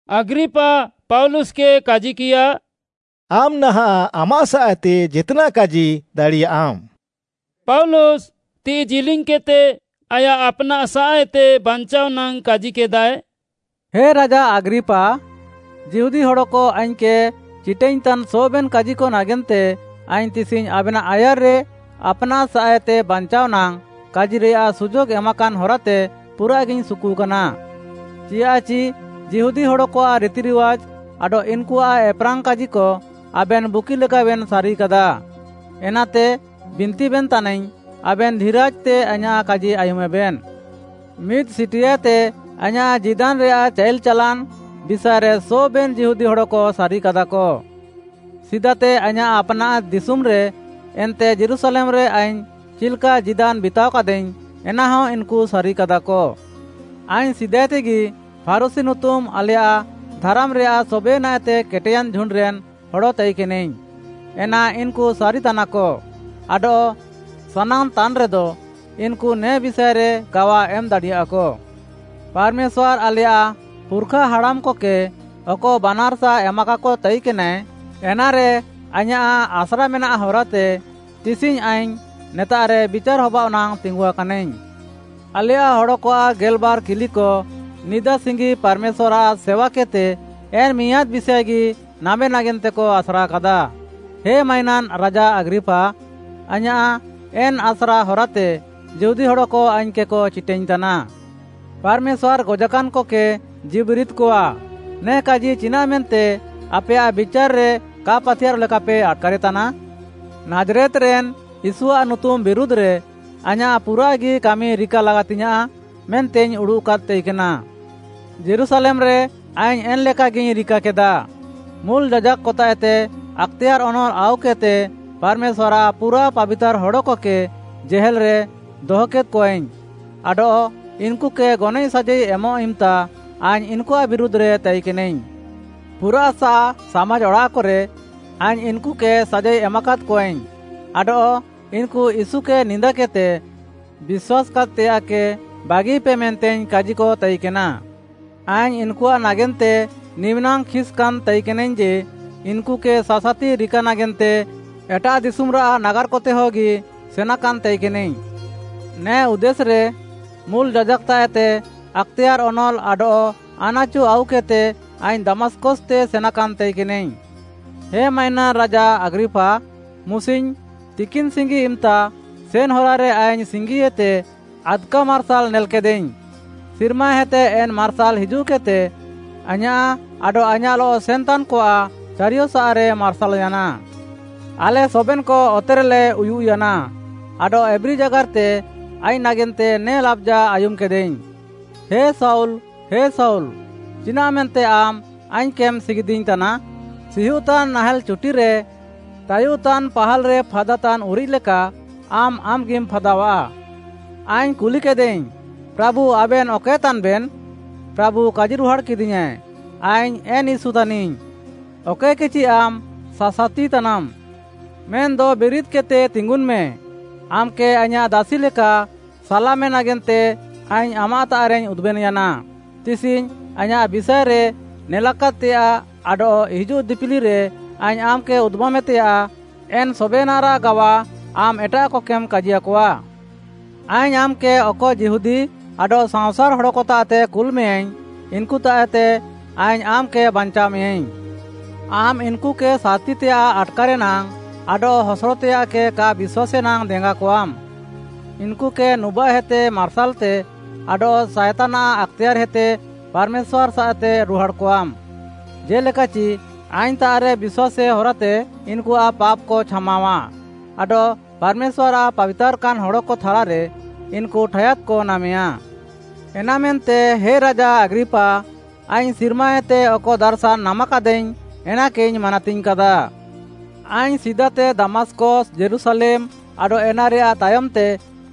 ଆଗ୍ରିପା ପାଉଲୁସ୍‍କେ କାଜିକିୟା, “ଆମ୍‌ ନାହାଁଃ ଆମାଃ ସାଃଏତେ ଜେତ୍‌ନାଃ କାଜି ଦାଡ଼ିୟାଃମ୍‌।” ପାଉଲୁସ୍‌ ତିଃଇ ଜିଲିଙ୍ଗ୍‌କେଦ୍‌ତେ ଆୟାଃ ଆପ୍‌ନାଃସାଃଏତେ ବାଞ୍ଚାଅଃ ନାଙ୍ଗ୍‌ କାଜିକେଦାଏ, “ହେ ରାଜା ଆଗ୍ରିପା, ଯିହୁଦୀ ହଡ଼କ ଆଇଙ୍ଗ୍‌କେ ଚିଟାଇଙ୍ଗ୍‌ତାନ୍ ସବେନ୍‍ କାଜିକ ନାଗେନ୍ତେ ଆଇଙ୍ଗ୍‌ ତିସିଙ୍ଗ୍‌ ଆବେନାଃ ଆୟାର୍‌ରେ ଆପ୍‌ନାଃସାଃଏତେ ବାଞ୍ଚାଅଃ ନାଙ୍ଗ୍‌ କାଜିରେୟାଃ ସୁଯୋଗ୍‌ ଏମାକାନ୍‌ ହରାତେ ପୁରାଃଗିଇଙ୍ଗ୍‌ ସୁକୁକାନା। ଚିଆଃଚି ଯିହୁଦୀ ହଡ଼କଆଃ ରିତିରିୱାଜ୍‌ ଆଡଃ ଇନ୍‌କୁଆଃ ଏପ୍‍ରାଙ୍ଗ୍‌ କାଜିକ ଆବେନ୍‌ ବୁଗିଲେକାବେନ୍‌ ସାରିକାଦା। ଏନାତେ ବିନ୍ତିବେନ୍‌ ତାନାଇଙ୍ଗ୍‌, ଆବେନ୍‌ ଧିରାଜ୍‌ତେ ଆଇଁୟାଃ କାଜି ଆୟୁମେବେନ୍‌। “ମିଦ୍‌ ସିଟିଆଏତେ ଆଇଁୟାଃ ଜୀଦାନ୍‌ରେୟାଃ ଚାଇଲ୍‌ ଚାଲାନ୍‌ ବିଷାଏରେ ସବେନ୍‌ ଯିହୁଦୀ ହଡ଼କ ସାରିକାଦାକ। ସିଦାତେ ଆଇଁୟାଃ ଆପ୍‌ନାଃ ଦିଶୁମ୍‌ରେ ଏନ୍ତେ ଯୀରୁଶାଲେମ୍‌ରେ ଆଇଙ୍ଗ୍‌ ଚିଲ୍‌କା ଜୀଦାନ୍‌ ବିତାଅକାଦାଇଙ୍ଗ୍‌, ଏନାହ ଇନ୍‌କୁ ସାରିକାଦାକ। ଆଇଙ୍ଗ୍‌ ସିଦାଏତେଗି ଫାରୁଶୀ ନୁତୁମ୍‌ ଆଲେୟାଃ ଧାରାମ୍‌ରେୟାଃ ସବେନାଃଏତେ କେଟେୟାନ୍‌ ଝୁଣ୍ଡ୍‌ରେନ୍‌ ହଡ଼ ତାଇକେନାଇଙ୍ଗ୍‌, ଏନା ଇନ୍‌କୁ ସାରିତାନାକ ଆଡଃ ସାନାଙ୍ଗ୍‌ ତାନ୍‌ରେଦ, ଇନ୍‌କୁ ନେ ବିଷାଏରେ ଗାୱା ଏମ୍‌ ଦାଡ଼ିୟାଃକ। ପାର୍‌ମେଶ୍ୱାର୍‌ ଆଲେୟାଃ ପୁର୍‌ଖା ହାଡ଼ାମ୍‌କକେ ଅକ ବାନାର୍‌ସା ଏମାକାକ ତାଇକେନାଏ, ଏନାରେ ଆଇଁୟାଃ ଆସ୍ରା ମେନାଃ ହରାତେ ତିସିଙ୍ଗ୍‌ ଆଇଙ୍ଗ୍‌ ନେତାଃରେ ବିଚାର୍‌ ହବାଅଃ ନାଙ୍ଗ୍‌ ତିଙ୍ଗୁକାନାଇଙ୍ଗ୍‌। ଆଲେୟାଃ ହଡ଼କଆଃ ଗେଲ୍‌ବାର୍‌ କିଲିକ ନିଦା ସିଙ୍ଗି ପାର୍‌ମେଶ୍ୱାର୍‌ଆଃ ସେୱାକେଦ୍‌ତେ ଏନ୍‌ ମିଆଁଦ୍‌ ବିଷାଏଗି ନାମେ ନାଗେନ୍ତେକ ଆସ୍ରାକାଦା। ହେ ମାଇନାନ୍‌ ରାଜା ଆଗ୍ରିପା, ଆଇଁୟାଃ ଏନ୍‌ ଆସ୍ରା ହରାତେ ଯିହୁଦୀ ହଡ଼କ ଆଇଙ୍ଗ୍‌କେକ ଚିଟାଇଙ୍ଗ୍‌ତାନା। ପାର୍‌ମେଶ୍ୱାର୍‌ ଗଜାକାନ୍‍କକେ ଜୀଉବିରିଦ୍‌କଆ, ନେ କାଜି ଚିନାଃମେନ୍ତେ ଆପେୟାଃ ବିଚାର୍‌ରେ କା ପାତିୟାର୍‍ରଃ ଲେକାପେ ଆଟ୍‌କାରେତାନା? “ନାଜ୍‌ରେତ୍‌ରେନ୍‌ ୟୀଶୁଆଃ ନୁତୁମ୍‌ ବିରୁଧ୍‌ରେ ଆଇଁୟାଃ ପୁରାଃଗି କାମି ରିକା ଲାଗାତିଙ୍ଗ୍‌ୟାଁଃ ମେନ୍ତେଇଙ୍ଗ୍‌ ଉଡ଼ୁଃକାଦ୍‌ ତାଇକେନା। ଯୀରୁଶାଲେମ୍‌ରେ ଆଇଙ୍ଗ୍‌ ଏନ୍‌ଲେକାଗିଇଙ୍ଗ୍‌ ରିକାକେଦା। ମୁଲ୍‌ ଯାଜାକ୍‌କତାଃଏତେ ଆକ୍‌ତେୟାର୍‌ ଅନଲ୍‌ ଆଉକେଦ୍‌ତେ ପାର୍‌ମେଶ୍ୱାର୍‌ଆଃ ପୁରାଃ ପାବିତାର୍‌ ହଡ଼କକେ ଜେହେଲ୍‌ରେ ଦହକେଦ୍‌କଆଇଙ୍ଗ୍‌ ଆଡଃ ଇନ୍‌କୁକେ ଗନଏଃ ସାଜାଇ ଏମଃ ଇମ୍‌ତା ଆଇଙ୍ଗ୍‌ ଇନ୍‌କୁଆଃ ବିରୁଧ୍‌ରେ ତାଇକେନାଇଙ୍ଗ୍‌। ପୁରାଃସାଃ ସାମାଜ୍‌ ଅଡ଼ାଃକରେ ଆଇଙ୍ଗ୍‌ ଇନ୍‌କୁକେ ସାଜାଇ ଏମାକାଦ୍‌କଆଇଙ୍ଗ୍‌ ଆଡଃ ଇନ୍‌କୁ ୟୀଶୁକେ ନିନ୍ଦାକେଦ୍‌ତେ ବିଶ୍ୱାସ୍‌କାଦ୍‌ତେୟାଃକେ ବାଗିପେ ମେନ୍ତେଇଙ୍ଗ୍‌ କାଜିକତାଇକେନା। ଆଇଙ୍ଗ୍‌ ଇନ୍‌କୁଆଃ ନାଗେନ୍ତେ ନିମିନାଙ୍ଗ୍‌ ଖିସ୍‌କାନ୍‌ ତାଇକେନାଇଙ୍ଗ୍‌ ଯେ, ଇନ୍‌କୁକେ ସାସାତି ରିକା ନାଗେନ୍ତେ ଏଟାଃଦିଶୁମ୍‌ରାଃ ନାଗାର୍‌କତେହଗି ସେନାକାନ୍‌ ତାଇକେନାଇଙ୍ଗ୍‌। “ନେ ଉଦ୍ଦେଶ୍‌ରେ ମୁଲ୍‌ ଯାଜାକ୍‌ତାଃଏତେ ଆକ୍‌ତେୟାର୍‌ ଅନଲ୍‌ ଆଡଃ ଆନାଚୁ ଆଉକେଦ୍‌ତେ ଆଇଙ୍ଗ୍‌ ଦମାସ୍‌କସ୍‌ତେ ସେନାକାନ୍‌ ତାଇକେନାଇଙ୍ଗ୍‌। ହେ ମାଇନାନ୍‌ ରାଜା ଆଗ୍ରିପା, ମୁସିଙ୍ଗ୍‌ ତିକିନ୍‌ସିଙ୍ଗି ଇମ୍‌ତା ସେନ୍‌ ହରାରେ ଆଇଙ୍ଗ୍‌ ସିଙ୍ଗିଏତେ ଆଦ୍‌କା ମାର୍ସାଲ୍‌ ନେଲ୍‌କେଦାଇଙ୍ଗ୍‌, ସିର୍ମାହେତେ ଏନ୍‌ ମାର୍ସାଲ୍‌ ହିଜୁଃକେଦ୍‌ତେ ଆଇଁୟାଃ ଆଡଃ ଆଇଁୟାଃଲଃ ସେନ୍‌ତାନ୍‌କଆଃ ଚାରିୟସାଃରେ ମାର୍ସାଲ୍‌ୟାନା। ଆଲେ ସବେନ୍‌କ ଅତେରେଲେ ଉୟୁଃୟାନା ଆଡଃ ଏବ୍ରୀ ଜାଗାର୍‌ତେ ଆଇଙ୍ଗ୍‌ ନାଗେନ୍ତେ ନେ ଲାବ୍‌ଜା ଆୟୁମ୍‌କେଦାଇଙ୍ଗ୍‌, ‘ହେ ଶାଉଲ୍, ହେ ଶାଉଲ୍‌, ଚିନାଃମେନ୍ତେ ଆମ୍‌ ଆଇଙ୍ଗ୍‌କେମ୍‌ ସିଗିଦିଇଙ୍ଗ୍‌ତାନା? ସିହୁଃତାନ୍‌ ନାଏଁହାଲ୍‌ ଚୁଟିରେ ତାୟୁଃତାନ୍‌ ପାହାଲ୍‍ରେ ଫାଦାତାନ୍‌ ଉରିଃକ୍‌ ଲେକା ଆମ୍‌ ଆମ୍‌ଗି ଫାଦାଅଃଆ।’ ଆଇଙ୍ଗ୍‌ କୁଲିକେଦାଇଙ୍ଗ୍‌, ‘ପ୍ରାଭୁ ଆବେନ୍‌ ଅକଏତାନ୍‌ବେନ୍‌?’ ପ୍ରାଭୁ କାଜିରୁହାଡ଼୍‌କେଦିୟାଁଏ, ‘ଆଇଙ୍ଗ୍‌ ଏନ୍‌ ୟୀଶୁ ତାନିଙ୍ଗ୍‌, ଅକଏକେଚି ଆମ୍‌ ସାସାତିତାନାମ୍‌। ମେନ୍‌ଦ ବିରିଦ୍‌କେଦ୍‌ତେ ତିଙ୍ଗୁନ୍‌ମେ, ଆମ୍‌କେ ଆଇଁୟାଃ ଦାସି ଲେକା ସାଲାମେ ନାଗେନ୍ତେ ଆଇଙ୍ଗ୍‌ ଆମ୍‌ତାଃରେଇଙ୍ଗ୍‌ ଉଦୁବେନ୍‌ୟାନା। ତିସିଙ୍ଗ୍‌ ଆଇଁୟାଃ ବିଷାଏରେ ନେଲାକାଦ୍‌ତେୟାଃ ଆଡଃ ହିଜୁଃ ଦିପିଲିରେ ଆଇଙ୍ଗ୍‌ ଆମ୍‌କେ ଉଦୁବାମେତେୟାଃ, ଏନ୍‌ ସବେନାଃରାଃ ଗାୱା ଆମ୍‌ ଏଟାଃକକେମ୍‌ କାଜିୟାକଆ। ଆଇଙ୍ଗ୍‌ ଆମ୍‌କେ ଅକ ଯିହୁଦୀ ଆଡଃ ସାଅଁସାର୍‌ ହଡ଼କତାଃତେ କୁଲ୍‌ମେୟାଁଇଙ୍ଗ୍‌, ଇନ୍‌କୁତାଃଏତେ ଆଇଙ୍ଗ୍‌ ଆମ୍‌କେ ବାଞ୍ଚାଅମେୟାଁଇଙ୍ଗ୍‌। ଆମ୍‌ ଇନ୍‌କୁକେ ସାର୍‌ତିତେୟାଃ ଆଟ୍‌କାରେ ନାଙ୍ଗ୍‌ ଆଡଃ ହସଡ଼ତେୟାଃକେ କା ବିଶ୍ୱାସେ ନାଙ୍ଗ୍‌ ଦେଙ୍ଗାକଆମ୍‌, ଇନ୍‌କୁକେ ନୁବାଃହେତେ ମାର୍ସାଲ୍‌ତେ ଆଡଃ ସାଏତାନ୍‌ଆଃ ଆକ୍‌ତେୟାର୍‌ହେତେ ପାର୍‌ମେଶ୍ୱାର୍‌ସାଃତେ ରୁହାଡ଼୍‌କଆମେ, ଜେ'ଲେକାଚି ଆଇଙ୍ଗ୍‌ତାଃରେ ବିଶ୍ୱାସେ ହରାତେ ଇନ୍‌କୁଆଃ ପାପ୍‌କ ଛାମାଅଃଆ ଆଡଃ ପାର୍‌ମେଶ୍ୱାର୍‌ଆଃ ପାବିତାର୍‌କାନ୍‌ ହଡ଼କ ଥାଲାରେ ଇନ୍‌କୁ ଠାୟାଦ୍‌କ ନାମେୟା।’ “ଏନାମେନ୍ତେ ହେ ରାଜା ଆଗ୍ରିପା, ଆଇଙ୍ଗ୍‌ ସିର୍ମାଏତେ ଅକ ଦାର୍‌ଶାନ୍‌ ନାମାକାଦାଇଙ୍ଗ୍‌ ଏନାକେଇଙ୍ଗ୍‌ ମାନାତିଙ୍ଗ୍‌କାଦା। ଆଇଙ୍ଗ୍‌ ସିଦାତେ ଦମାସ୍‌କସ୍‌, ଯୀରୁଶାଲେମ୍‌ ଆଡଃ ଏନାରେୟାଃ ତାୟମ୍‌ତେ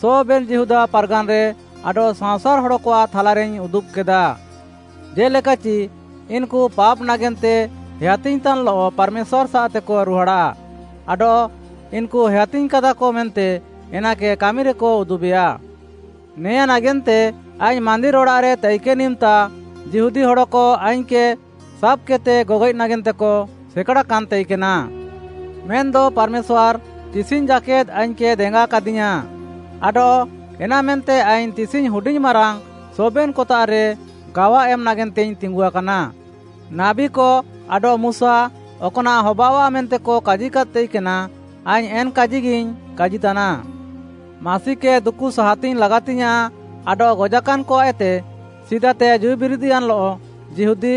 ସବେନ୍‌ ଯିହୁଦା ପାର୍‌ଗାନ୍‌ରେ ଆଡଃ ସାଅଁସାର୍‌ ହଡ଼କଆଃ ଥାଲାରେଇଙ୍ଗ୍‌ ଉଦୁବ୍‌କେଦା, ଜେ'ଲେକାଚି ଇନ୍‌କୁ ପାପ୍‌ ନାଗେନ୍ତେ ହେୟାତିଙ୍ଗ୍‌ତାନ୍‌ଲଃ ପାର୍‌ମେଶ୍ୱାର୍‌ସାଃତେକ ରୁହାଡ଼ାଃ ଆଡଃ ଇନ୍‌କୁ ହେୟାତିଙ୍ଗ୍‌କାଦାକ ମେନ୍ତେ ଏନାକେ କାମିରେକ ଉଦୁବେୟା। ନେଆଁ ନାଗେନ୍ତେ ଆଇଙ୍ଗ୍‌ ମାନ୍ଦିର୍‌ ଅଡ଼ାଃରେ ତାଇକେନ୍‌ ଇମ୍‌ତା ଯିହୁଦୀ ହଡ଼କ ଆଇଙ୍ଗ୍‌କେ ସାବ୍‌କେଦ୍‌ତେ ଗଗଏଃ ନାଗେନ୍ତେକ ସେକାଡ଼ାକାନ୍‌ ତାଇକେନା। ମେନ୍‌ଦ ପାର୍‌ମେଶ୍ୱାର୍‌ ତିସିଙ୍ଗ୍‌ ଜାକେଦ୍‌ ଆଇଙ୍ଗ୍‌କେ ଦେଙ୍ଗାକାଦିୟାଁ ଆଡଃ ଏନାମେନ୍ତେ ଆଇଙ୍ଗ୍‌ ତିସିଙ୍ଗ୍‌ ହୁଡିଙ୍ଗ୍‌ ମାରାଙ୍ଗ୍‌ ସବେନ୍‌କତାଃରେ ଗାୱା ଏମ୍‌ ନାଗେନ୍ତେଇଙ୍ଗ୍‌ ତିଙ୍ଗୁଆକାନା। ନାବୀକ ଆଡଃ ମୁଶା, ଅକ୍‌ନାଃ ହବାଅଃଆ ମେନ୍ତେକ କାଜିକାଦ୍‌ ତାଇକେନା, ଆଇଙ୍ଗ୍‌ ଏନ୍‌ କାଜିକେଗିଇଙ୍ଗ୍‌ କାଜିତାନା। ମାସିକେ ଦୁକୁ ସାହାତିଙ୍ଗ୍‌ ଲାଗାତିଙ୍ଗ୍‌ୟାଁଃ ଆଡଃ ଗଜାକାନ୍‌କଆଃଏତେ ସିଦାତେ ଜୀଉବିରିଦ୍‌ୟାନ୍‌ଲଃ ଯିହୁଦୀ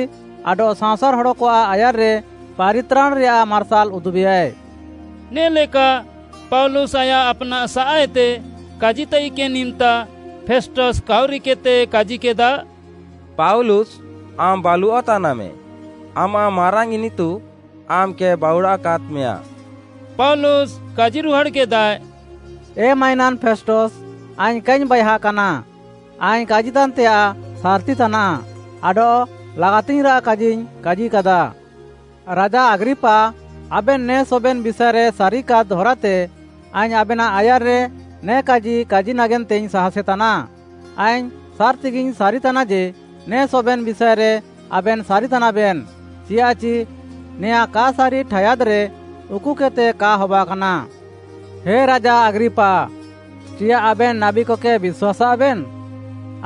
ଆଡଃ ସାଅଁସାର୍‌ ହଡ଼କଆଃ ଆୟାର୍‌ରେ ପାରିତ୍ରାଣ୍‌ରେୟାଃ ମାର୍ସାଲ୍‌ ଉଦୁବେୟାଏ।” ନେ'ଲେକା ପାଉଲୁସ୍‌ ଆୟାଃ ଆପ୍‌ନାଃସାଃଏତେ କାଜିତାଇକେନ୍‌ ଇମ୍‌ତା, ଫେଷ୍ଟସ୍‌ କାଉରିକେଦ୍‌ତେ କାଜିକେଦା, “ପାଉଲୁସ୍‌, ଆମ୍‌ ବାଲୁଅଃ ତାନାମେ! ଆମାଃ ମାରାଙ୍ଗ୍‌ ଇନିତୁ ଆମ୍‌କେ ବାଉଡ଼ାକାଦ୍‌ମେୟାଁ!” ପାଉଲୁସ୍‌ କାଜିରୁହାଡ଼୍‌କେଦାଏ, “ଏ ମାଇନାନ୍‌ ଫେଷ୍ଟସ୍‌, ଆଇଙ୍ଗ୍‌ କାଇଙ୍ଗ୍‌ ବାଏହାକାନା, ଆଇଙ୍ଗ୍‌ କାଜିତାନ୍‌ତେୟାଃ ସାର୍‌ତିତାନାଃ ଆଡଃ ଲାଗାତିଙ୍ଗ୍‌ରାଃ କାଜିଇଙ୍ଗ୍‌ କାଜିକାଦା। ରାଜା ଆଗ୍ରିପା, ଆବେନ୍‌ ନେ ସବେନ୍‌ ବିଷାଏରେ ସାରିକାଦ୍‌ ହରାତେ ଆଇଙ୍ଗ୍‌ ଆବେନାଃ ଆୟାର୍‌ରେ ନେ କାଜି କାଜି ନାଗେନ୍ତେଇଙ୍ଗ୍‌ ସାହାସେତାନା, ଆଇଙ୍ଗ୍‌ ସାର୍‌ତିଗିଇଙ୍ଗ୍‌ ସାରିତାନା ଯେ, ନେ ସବେନ୍‌ ବିଷାଏରେ ଆବେନ୍‌ ସାରିତାନାବେନ୍‌, ଚିଆଃଚି ନେଆଁ କା ସାରି ଠାୟାଦ୍‌ରେ ଉକୁକେଦ୍‌ତେ କା ହବାକାନା। ହେ ରାଜା ଆଗ୍ରିପା, ଚିୟାଃ ଆବେନ୍‌ ନାବୀକକେ ବିଶ୍ୱାସ୍‌ସାଃବେନ୍‌?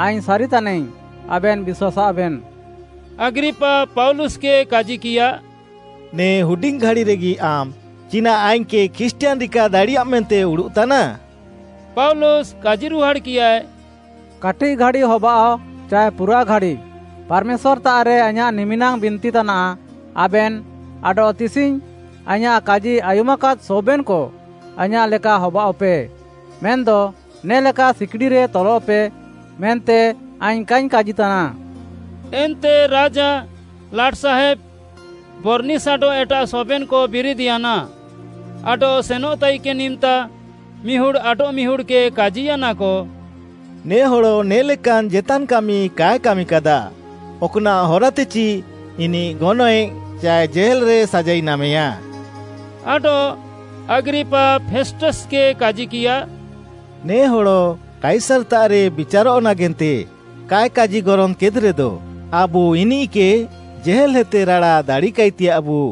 ଆଇଙ୍ଗ୍‌ ସାରିତାନାଇଙ୍ଗ୍‌ ଆବେନ୍‌ ବିଶ୍ୱାସ୍‌ସାଃବେନ୍‌!” ଆଗ୍ରିପା ପାଉଲୁସ୍‌କେ କାଜିକିୟା, “ନେ ହୁଡିଙ୍ଗ୍‌ ଘାଡ଼ିରେଗି ଆମ୍‌ ଚିନାଃ ଆଇଙ୍ଗ୍‌କେ ଖ୍ରୀଷ୍ଟିୟାନ୍‌ ରିକା ଦାଡ଼ିୟାମ୍‌ ମେନ୍ତେମ୍‌ ଉଡ଼ୁଃତାନା?” ପାଉଲୁସ୍‌ କାଜିରୁହାଡ଼୍‌କିୟାଏ, “କାଟିଃଘାଡ଼ି ହବାଅଃ ଚାଏ ପୁରାଃଘାଡ଼ି, ପାର୍‌ମେଶ୍ୱାର୍‌ତାଃରେ ଆଇଁୟାଃ ନିମିନାଙ୍ଗ୍‌ ବିନ୍ତିତାନାଃ, ଆବେନ୍‌ ଆଡଃ ତିସିଙ୍ଗ୍‌ ଆଇଁୟାଃ କାଜି ଆୟୁମ୍‌କାଦ୍‌ ସବେନ୍‌କ ଆଇଁୟାଃ ଲେକା ହବାଅଃପେ, ମେନ୍‌ଦ ନେ'ଲେକା ସିକିଡ଼ିରେ ତଲଃପେ ମେନ୍ତେ ଆଇଙ୍ଗ୍‌ କାଇଙ୍ଗ୍‌ କାଜିତାନା।” ଏନ୍ତେ ରାଜା, ଲାଟ୍‌ସାହେବ୍‌, ବର୍‌ନିସ୍‌ ଆଡଃ ଏଟାଃ ସବେନ୍‌କ ବିରିଦ୍‌ୟାନା, ଆଡଃ ସେନଃ ତାଇକେନ୍‌ ଇମ୍‌ତା ମିହୁଡ଼୍‌ ଆଡଃମିହୁଡ଼୍‌କେ କାଜିୟାନାକ, “ନେ ହଡ଼ ନେ'ଲେକାନ୍‌ ଜେତାନ୍‌ କାମି କାଏ କାମିକାଦା, ଅକ୍‌ନାଃ ହରାତେଚି ଇନିଃ ଗନଏଃ ଚାଏ ଜେହେଲ୍‌ରେ ସାଜାଇ ନାମେୟାଏ।” ଆଡଃ ଆଗ୍ରିପା ଫେଷ୍ଟସ୍‌କେ କାଜିକିୟା, “ନେ ହଡ଼ କାଇସାର୍‌ତାଃରେ ବିଚାରଃ ନାଗେନ୍ତେ କାଏ କାଜିଗରଙ୍ଗ୍‌କେଦ୍‌ରେଦ, ଆବୁ ଇନିଃକେ ଜେହେଲ୍‌ହେତେ ରାଡ଼ା ଦାଡ଼ିକାଇତେୟାଃବୁ।”